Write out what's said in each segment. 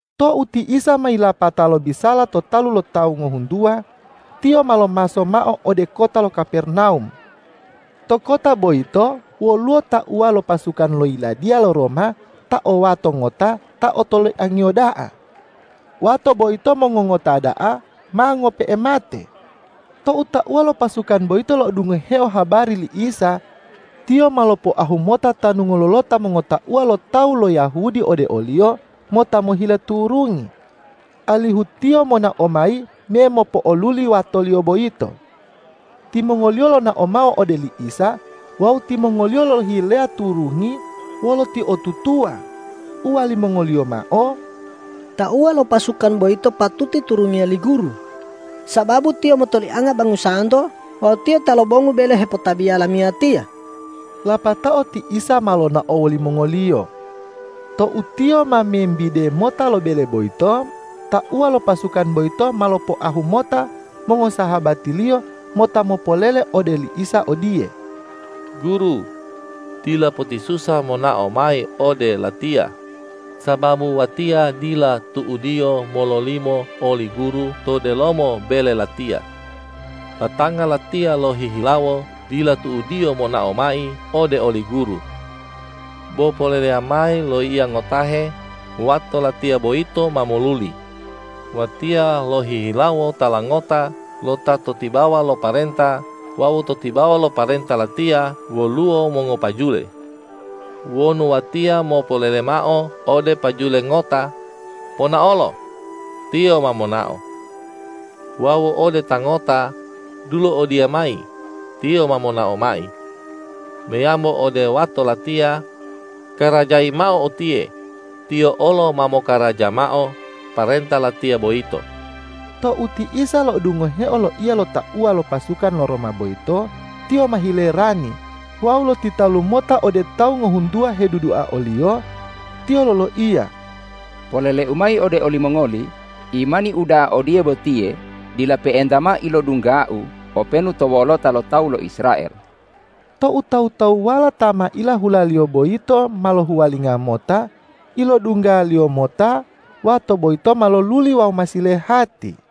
Tou ti Isa ma yilapata lobisala to talu lo tawu ngohuntuwa, Tiyo ma lomaso mao ode kota lo Kapernawum. To kota boyito woluwo tauwa lo pasukan lo yiladiya lo Roma ta o wato ngota ta otoliangiyo da'a. Wato boyito mongongota da'a ma ngope'e mate. Tou tauwa lo pasukan boyito lo'odungoheo habari li Isa, tiyo ma lopoahu mota tanu ngololota mongotauwa lo tawu lo Yahudi ode o-Liyo mota mohile turungi, alihu Tiyo monao mayi memopo'oluli watoliyo boyito. Timongoliyo lonao mao ode li Isa wawu timongoliyo lolohileya turungi wolo utiotutuwa, uwalimongoliyo mao,”Tauwa lo pasukan boyito patuti turungiya li Guru, sababu tiyo motolianga bangusanto wawu tiyo ta lomongu bele hepotabiya lamiyatiya.” Lapatao ti Isa ma lonao wolimongoliyo. Tou Tiyo ma membide mota lo bele boyito, tauwa lo pasukan boyito ma lopoahu mota mongosahabatiliyo mota mopolele ode li Isa odiye,”Guru, dila potisusa monao mayi ode latiya, sababu watiya dila tu'udiyo mololimo oli Guru to delomo bele latiya. Batanga latiya lohihilawo dila tu'udiyo monao mayi ode oli Guru. Bo poleleya mayi loiya ngotahe, wato latiya boyito ma moluli. Watiya lohihilawo tala ngota lo ta to tibawa lo parenta wawu to tibawa lo parenta latiya woluwo mongopajule. Wonu watiya mopolele mao ode pajule ngota: Ponaolo! Tiyo ma monao. Wawu ode ta ngota: Dulo odiya mayi! Tiyo ma monao mayi. Meyambo ode wato latiya: Karajayi mao utiye! Tiyo olo ma mokaraja mao parenta latiya boyito.” Tou ti Isa lo'odungoheo loiya lo tauwa lo pasukan lo Roma boyito, Tiyo ma hilerani wawu lotitalu mota ode tawu ngohuntuwa hedudua o-Liyo. Tiyo loloiya,”Polele-U mayi ode olimongoli: Imani uda'a odiye botiye dila pe'enta mao ilodungga-U openu to wolota lo tawu lo Israel.” Tou tawu-tawuwala ta ma ilahulaliyo boyito ma lohuwalinga mota, ilodunggaliyo mota wato boyito ma loluli wawu ma silehati.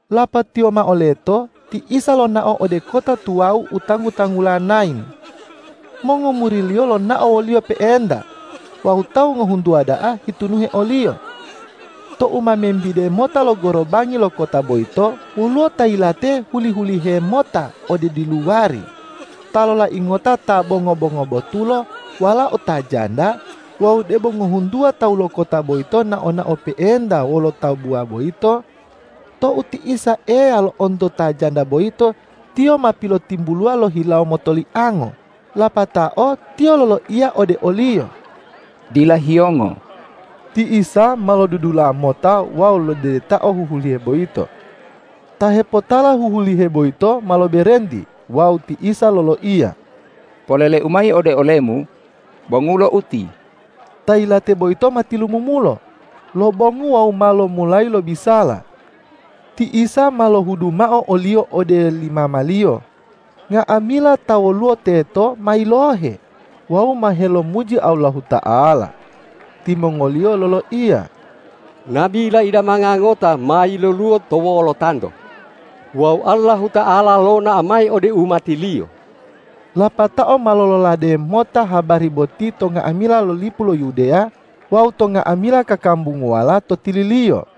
Lapatiyo mao leto, ti Isa lonao ode kota tuwawu u tanggu-tanggula Nain. Mongomuri-Liyo lonao wo-Liyo pe'enta wawu tawu ngohuntuwa da'a hitunuhe o-Liyo. Tou ma membide mota lo gorobangi lo kota boyito, woluwo ta yilate huli-hulihe mota ode diluwari, ta lolai ngota ta bo ngobo-ngobotulo walao ta janda, wawu debo ngohuntuwa tawu lo kota boyito nao-nao pe'enta wolo tabuwa boyito. Tou ti Isa Eya lo'onto ta janda boyito, Tiyo ma pilotimbuluwa lo hilawo motoliango, lapatao Tiyo loloiya ode oliyo,”Dila hiyongo!” Ti Isa ma lodudula mota wawu lodedetao huhulihe boyito. Ta hepotala huhulihe boyito ma loberenti wawu ti Isa loloiya,”Polele-U mayi ode olemu: Bongulo uti!” Ta yilate boyito ma tilumumulo, lobongu wawu ma lomulayi lobisala. Ti Isa ma lohudu mao oliyo ode li mamaliyo. Nga'amila ta woluwo teto ma yilohe wawu ma helomuji Allahuta'ala. Timongoliyo loloiya,”Nabi leidamanga ngota ma yiloluwo to wolotanto! Wawu Allahuta'ala lonao mayi ode umati-Liyo!” Lapatao ma lololade mota habari boti to nga'amila lipu lo Yudeya wawu to nga'amila kakambunguwala to tililiyo.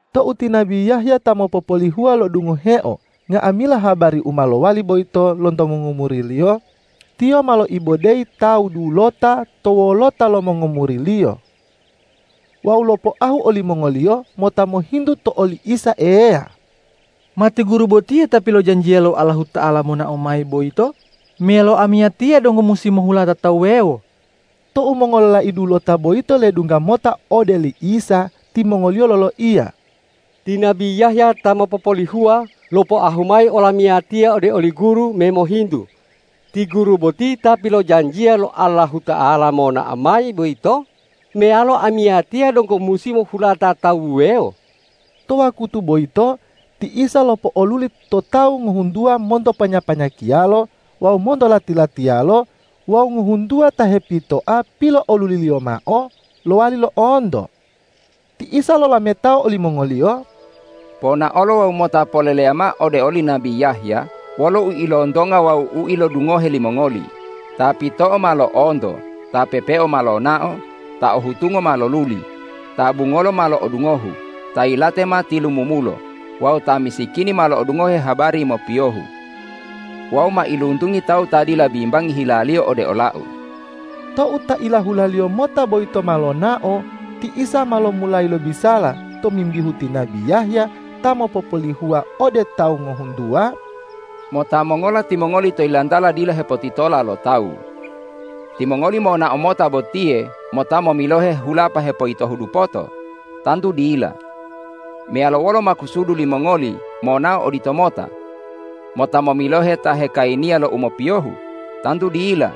Tou ti nabi Yahya ta mopopolihuwa lo'odungoheo nga'amila habari u ma lowali boyito lonto mongomuriliyo, tiyo ma loibodeyi tawu dulota to wolota lo mongomuriliyo. Wawu lopoahu olimongoliyo mota mohintu to oli Isa Eya,”Ma ti Guru botiye Ta pilojanjiya lo Allahuta'ala monao mayi boyito meyalo amiyatiya donggo musi mohulata tawu wuwewo?” Tou mongololai dulota boyito ledungga mota ode li Isa, timongoliyo loloiya,”Ti nabi Yahya ta mopopolihuwa lopoahu mayi olamiyatiya ode oli Guru memohintu, ’Ti Guru boti Ta pilojanjiya lo Allahuta'ala monao mayi boyito meyalo amiyatiya donggo musi mohulata tawu wuwewo?’” To wakutu boyito ti Isa lopo'oluli to tawu ngohuntuwa monto panya-panyakiyalo wawu monto lati-latiyalo wawu ngohuntuwa ta hepitoa pilo'oluli-Liyo mao lowali lo'onto. Ti Isa lolametao olimongoliyo,”Ponaolo wawu mota poleleya mao ode oli nabi Yahya wolo u ilontonga wawu u ilodungohe limongoli: Ta pito'o ma lo'onto, ta pepeo ma lonao, ta ohutungo ma loluli, ta bungolo ma lo'odungohu, ta yilate ma tilumumulo wawu ta misikini ma lo'odungohe habari mopiyohu. Wawu mailuntungi tawu ta dila bimbangi hilaliyo ode ola-U.” Tou ta ilahulaliyo mota boyito ma lonao, ti Isa ma lomulayi lobisala tomimbihu ti nabi Yahya ta mopopolihuwa ode tawu ngohuntuwa,”Mota mongola timongoli to yilantala dila hepotitola lo tawu? Timongoli monao mota botiye mota momilohe hulapa hepoyitohu dupoto? Tantu dila. Meyalo wolo makusudu limongoli monao oditomota? Mota momilohe ta hikayiniya lo u mopiyohu? Tantu dila.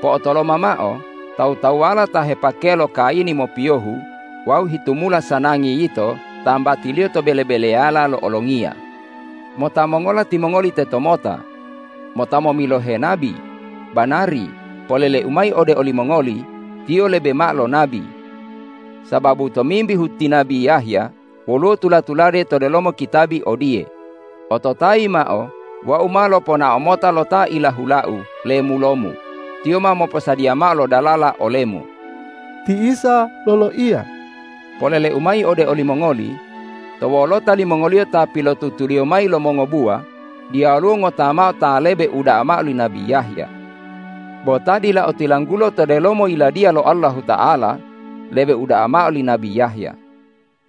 Po'otoloma mao, tawu-tawuwala ta hepakeya lo kayini mopiyohu wawu hitumula sanangi yito tambatiliyo to bele-beleyala lo olongiya! Mota mongola timongoli tetomota? Mota momilohe nabi? Banari, polele-U mayi ode olimongoli: Tiyo lebe mao lo nabi. Sababu tomimbihu ti nabi Yahya woluwo tula-tulade to delomo kitabi odiye, ’Ototayi mao: Wau ma loponao mota lo ta ilahula-U lemulo-Mu; tiyo ma moposadiya mao lo dalala ole-Mu!’” Ti Isa loloiya,”Polele-U mayi ode olimongoli: To wolota limongoliyo ta pilotutuliyo mayi lo mongobuwa, diyaluwo ngota mao ta lebe uda'a mao li nabi Yahya. Bo ta dila otilanggulo to delomo Yiladiya lo Allahuta'ala, lebe uda'a mao li nabi Yahya.”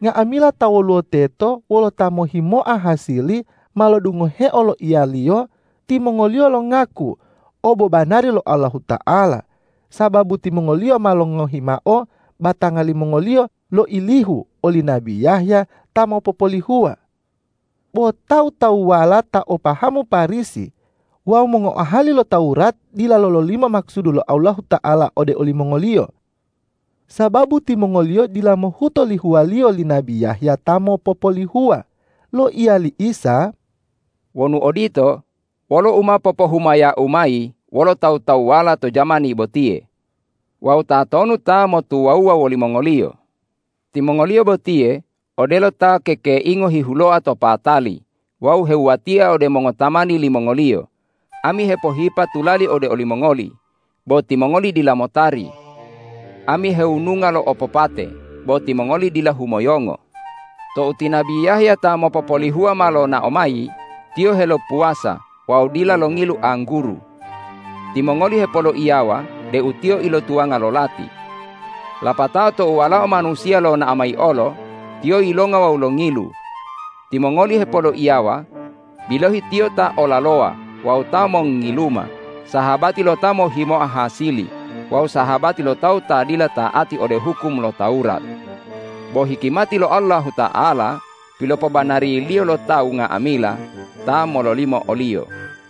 Nga'amila ta woluwo teto wolo ta mohhimoa hasili ma lodungoheo loiya-Liyo. Timongoliyo longaku obobanari lo Allahuta'ala, sababu timongoliyo ma longohi mao batanga limongoliyo loilihu oli nabi Yahya ta mopopolihuwa. Bo tawu-tawuwala ta o pahamu Parisi wawu mongoahali lo Tawurat dila lololimo makusudu lo Allahuta'ala ode olimongoliyo, sababu timongoliyo dila mohuto lihuwaliyo li nabi Yahya ta mopopolihuwa. Loiya li Isa,”Wonu odito, wolo u ma popohumaya-U mayi wolo tawu-tawuwala to jamani botiye? Wawu tatonu ta motuwawuwa wolimongoliyo? Timongoliyo botiye odelo ta kekeingo hihuloa to patali wawu hewuwatia ode mongotamani limongoliyo, ’Ami hepohipa tulali ode olimongoli, bo timongoli dila motari! Ami hewununga lo opopate, bo timongoli dila humoyongo!’ Tou ti nabi Yahya ta mopopolihuwa ma lonao mayi, tiyo helopuwasa wawu dila longilu angguru. Timongoli hepoloiyawa deu tiyo ilotuwanga lo lati. Lapatao tou Walao Manusiya lonao mayi olo, Tiyo yilonga wawu longilu. Timongoli hepoloiyawa: Bilohi, Tiyo ta olalowa wawu ta mongngiluma, sahabati lo ta mohhimoa hasili wawu sahabati lo tawu ta dila ta'ati ode hukum lo Tawurat! Bo hikimati lo Allahuta'ala pilopobanariliyo lo tawu nga'amila ta mololimo o-Liyo.”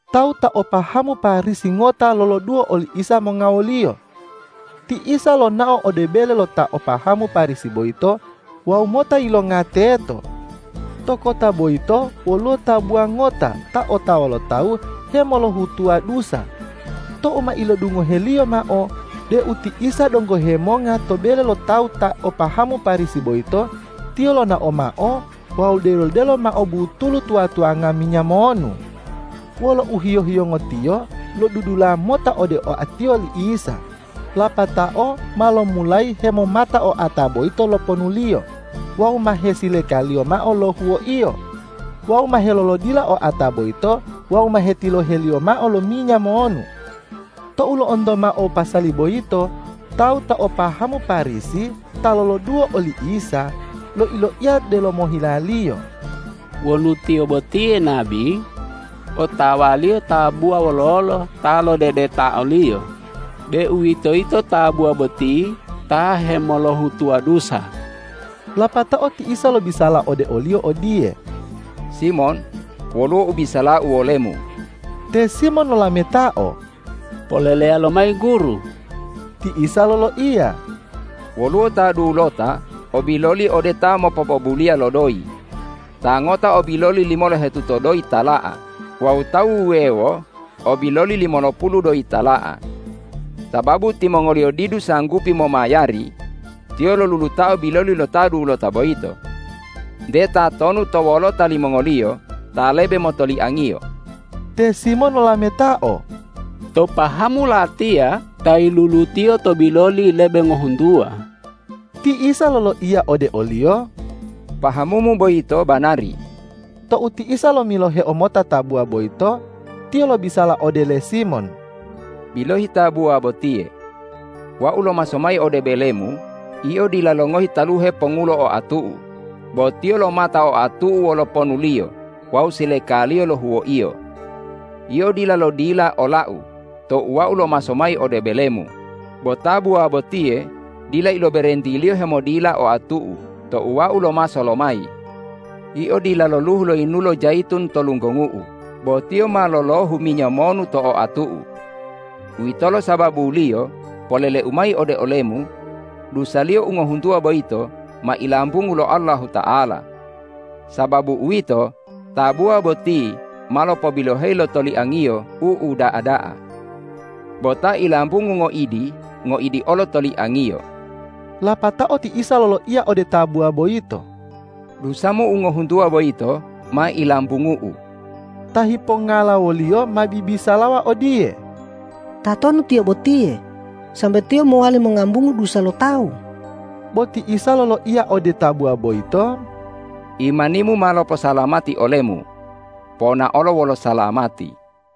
Tawu ta o pahamu Parisi ngota loloduwo oli Isa monga woliyo. Ti Isa lonao ode bele lo ta o pahamu Parisi boyito wawu mota yilonga teto. To kota boyito woluwo tabuwa ngota ta otawa lo tawu hemolohutuwa dusa. Tou ma ilodungoheliyo mao deu ti Isa donggo hemonga to bele lo tawu ta o pahamu Parisi boyito, tiyo lonao mao wawu delo-delo mao butulu tuwa-tuwanga minya monu. Wolo uhiyo-hiyongo tiyo lodudula mota ode oatiyo li Isa, lapatao ma lomulayi hemomata oata boyito lo ponuliyo, wawu ma hesilekaliyo mao lo huwoiyo, wawu ma helolodila oata boyito wawu ma hetiloheliyo mao lo minya monu. Tou lo'onto mao pasali boyito, tawu ta o pahamu Parisi ta loloduwo oli Isa, loi-loiya delomo hilaliyo,”Wonu Tiyo botiye nabi, otawa-Liyo tabuwa wololo ta lodedeta o-Liyo, deuwitoyito tabuwa boti ta hemolohutuwa dusa.” Lapatao ti Isa lobisala ode oliyo odiye,”Simon, woluwo u bisala-U wolemu.” Te Simon lolametao,”Poleleya lomayi Guru.” Ti Isa loloiya,”Woluwo ta dulota o biloli ode ta mopopobuliya lo doyi. Ta ngota o biloli limolohetuto doyi tala'a wawu tawu wuwewo o biloli limolopulu doyi tala'a. Sababu timongoliyo didu sanggupi momayari, tiyo lolulutao biloli lo ta dulota boyito. Nte tatonu to wolota limongoliyo ta lebe motoliangiyo?” Te Simon lolametao,”To pahamu latiya ta yilulutiyo to biloli lebe ngohuntuwa.” Ti Isa loloiya ode oliyo,”Pahamumu boyito banari.” Tou ti Isa lomiloheo mota tabuwa boyito, Tiyo lobisala ode le Simon,”Bilohi tabuwa botiye! Wau lomaso mayi ode belemu, yio dila longohi taluhe pongulo oatu-U, bo tiyo lomata oatu-U wolo ponuliyo wawu silekaliyo lo huwoiyo. Yio dila lodila ola-U tou Wau lomaso ode belemu, bo tabuwa botiye dila iloberentiliyo hemodila oatu-U tou Wau lomaso lo mayi. Yio dila lolohu yinulo jayitun to lunggongu-U, bo tiyo ma lolohu minya monu to oatu-U. Uwitolo sababuliyo polele-U mayi ode olemu: Dusaliyo u ngohuntuwa boyito ma ilambungu lo Allahuta'ala. Sababu uwito, tabuwa boti ma lopobiloheyi lo toliangiyo u uda'a da'a. Bo ta ilambungu ngoidi, ngoidi olo toliangiyo.” Lapatao ti Isa loloiya ode tabuwa boyito,”Dusamu u ngohuntuwa boyito ma ilambungu-U.” Ta hipongala wo-Liyo ma bibisalawa odiye,”Tatonu Tiyo botiye, sambe Tiyo mowali mongambungu dusa lo tawu?” Bo ti Isa loloiya ode tabuwa boyito,” Imanimu ma loposalamati olemu. Ponaolo wolo salamati!”